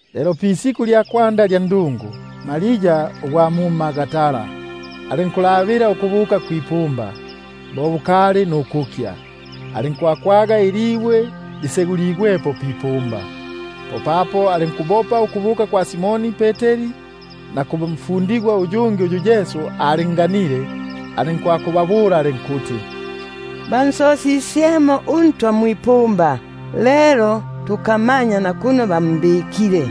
Lelo pisiku lya kwanda lya ndungu, Maria ugwa mu Magdala alinkutemelela ukubuka kwipumba bo kukali nukukya, alinkwakwaga ilibwe liseguligwepo pipumba. Popapo alinkubopa ukubuka kwa Simoni Peteri, na kumfundigwa uyungi uyu Yesu alinganile, alinkubabula alinkuti: Bansosisyemo uNtwa mwipumba, lelo tukamanya nakuno bambikile.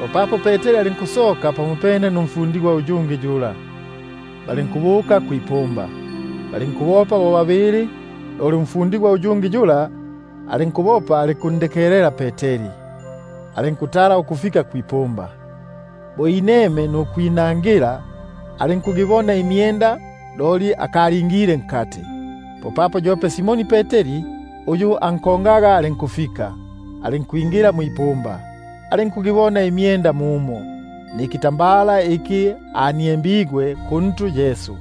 Popapo Peteri alinkusoka pamopene numfundigwa uyungi yula, balinkubuka kwipumba. Balinkubopa bo babili, loli umfundigwa uyungi yula alinkubopa alinkundekelela Peteri, alinkutala ukufika kwipumba; alinkwinama nukwinangila, alinkugibona imyenda, loli alinkusita nukwingila. Popapo yope Simoni Peteri uyu ankongaga alinkufika, alinkwingila mwipumba; alinkugibona imyenda mumo, nikitambala iki kyali pantu pamyake,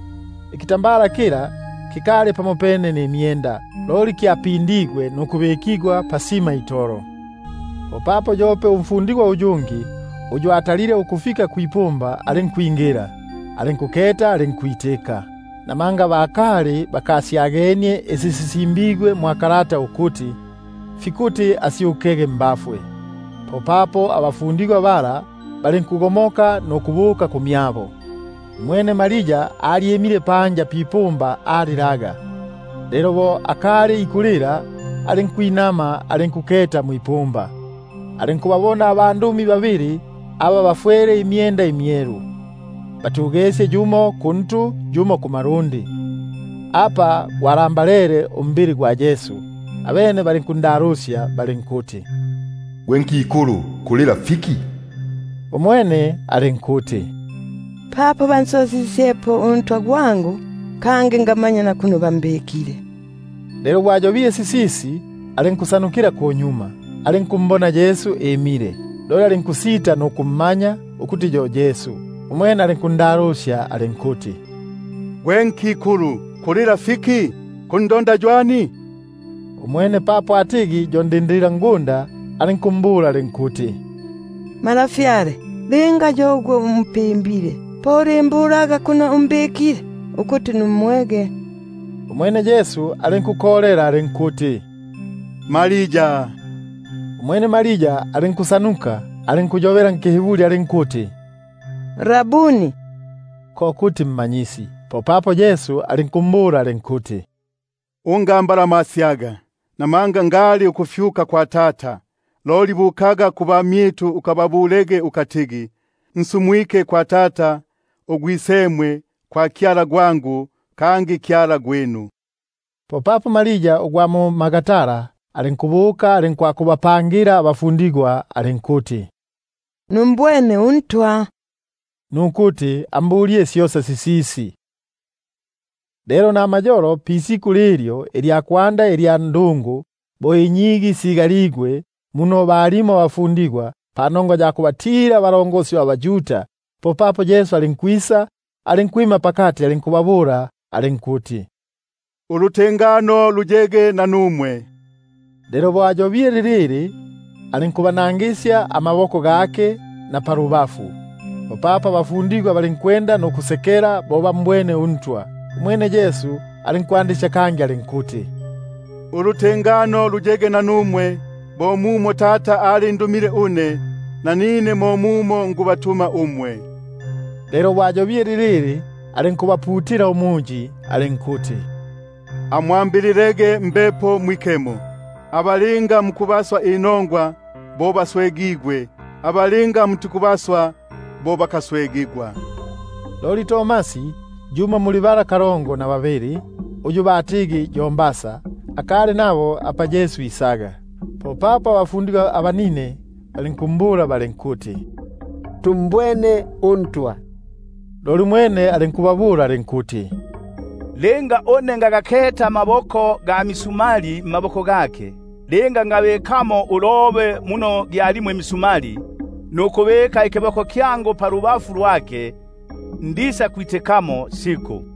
kyo kikali pamopene nimyenda, loli kyaliniengenie pasima itolo. Popapo yope umfundigwa uyungi, uyu atalile ukufika kwipumba alinkwingila, alinkuketa, alinkwitika. Namanga bakali bakasyagenie isi sisimbigwe ukuti: Fikuti asyukege mbafwe. Popapo abafundigwa bala balinkugomoka kangi ukubuka kumyabo. Umwene Maria loli alyimile panja pipumba alilaga; lelo bo akali ikulila, alinkwinama alinkuketa mwipumba; alinkubabona abandumi babili aba bafwele imyenda imyelu, batugesye yumo kuntu yumo kumalundi, apa gwalambalele umbili gwa Yesu. Abene balinkundalusya balinkuti: Gwe nkikulu, kulila fiki? Umwene alinkuti: Papo bansosisyepo uNtwa gwangu, kangi ngamanya nakuno bambikile. Lelo bo ayobile sisisi, alinkusyutukila kunyuma, alinkumbona Yesu imile; loli alinkusita nukummanya ukuti yo Yesu. Umwene Yesu alinkundalusya alinkuti: Gwe nkikulu, kulila fiki? Kundonda ywani? Umwene papo atigi yo ndindililangunda, alinkumbula alinkuti: Malafyale, linga yo ugwe umpimbile, po ulimbulaga kuno umbikile ukuti ngansosyepo. Umwene Yesu alinkuko- lela alinkuti: Maria! Umwene alinkusyutuka, alinkuyobela nkiHiburi alinkuti: Rabuni, (ko kuti Mmanyisi). Popapo Yesu alinkumbula alinkuti: Ungambalamasyaga, buno ngali ukufyuka kwa Tata; loli bukaga kubamyitu ukababulege ukatigi: Nsumwike kwa Tata, uGwisemwe; kwa Kyala gwangu, kangi Kyala gwinu. Popapo Maria ugwa mu-Magdala alinkubuka, alinkwakubapangila abafundigwa alinkuti: Numbwene uNtwa, nukuti ambulile syosa sisisi. Lelo namayolo, pisiku lilyo ilya kwanda ilya ndungu, bo inyigi sigaligwe muno balimo abafundigwa, panongwa ya kuhatila abaYuda, popapo Yesu alinkwisa, alinkwima pakati, alinkubabula alinkuti: Ulutengano luyege nanumwe. Lelo bo ayobile lilili, alinkubanangisya amaboko gake napalubafu. Popapo abafundigwa balinkusekela bo bambwene uNtwa. Umwene Yesu alinkwandisya kangi alinkuti: Ulutengano luyege nanumwe; bo mumo Tata alindumile une, nanine mo mumo nikubatuma nanumwe. Lelo bo ayobile lilili, alinkubaputila umuyi alinkuti: Amwambililege Mbepo Mwikemo. Aba linga mukubaswa inongwa, bo baswegigwe; aba linga mutikubaswa, bo bakaswegigwa. Loli Tomasi, yumo muli bala kalongo na babili, uyu batigi yo Didimo,#Didimo ko kuti mbasa. akali nabo apa Yesu isaga. Popapo abafundigwa abanine balinkumbula balinkuti: Tumbwene uNtwa; loli umwene alinkubabula alinkuti: Linga ngagaketa amakoko ga misumali mmaboko gake, linga ngabikamo ulobe muno gyalimo imisumali, nukubika ikiboko kyangu palubafu lwake, ndisakwitikamo siku.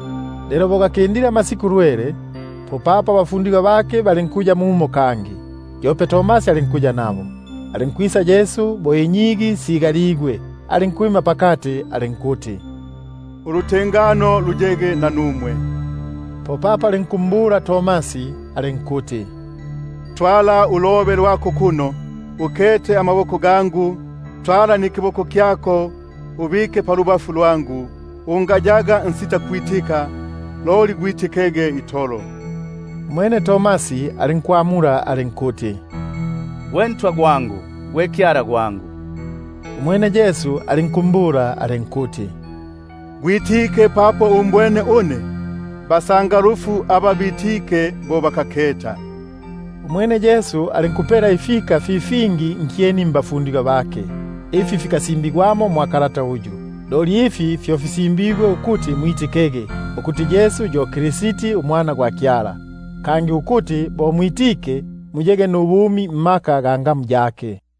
Lelo bo gakindile amasiku lwele, popapo abafundigwa bake balinkuya mumo kangi, yope Tomasi alinkuya nabo. Alinkwisa Yesu bo inyigi sigaligwe, alinkwima pakati alinkuti: Ulutengano luyege nanumwe. Popapo alinkumbula Tomasi alinkuti: Twala ulobe lwako kuno, ukete amaboko gangu, lwala nikiboko kyako ubike palubafu lwangu; ungayaga nsitakwitika, loli gwitikege itolo. Umwene Tomasi alinkwamula alinkuti: Gwe Ntwa gwangu, gwe Kyala gwangu! Umwene Yesu alinkumbula alinkuti: Gwitike papo umbwene une? Basangalufu aba bitike bo bakaketa. Umwene Yesu alinkupela ifika ifingi fi fingi nkyeni mbafu- ndigwa bake, ifi fikasimbigwamo mwa kalata uyu. Loli ifi fyo fisimbigwe ukuti mwitikege, ukuti Yesu yo Kristi uMwana gwa Kyala; kangi ukuti bo mwitike, muyege nubumi mungamu yake.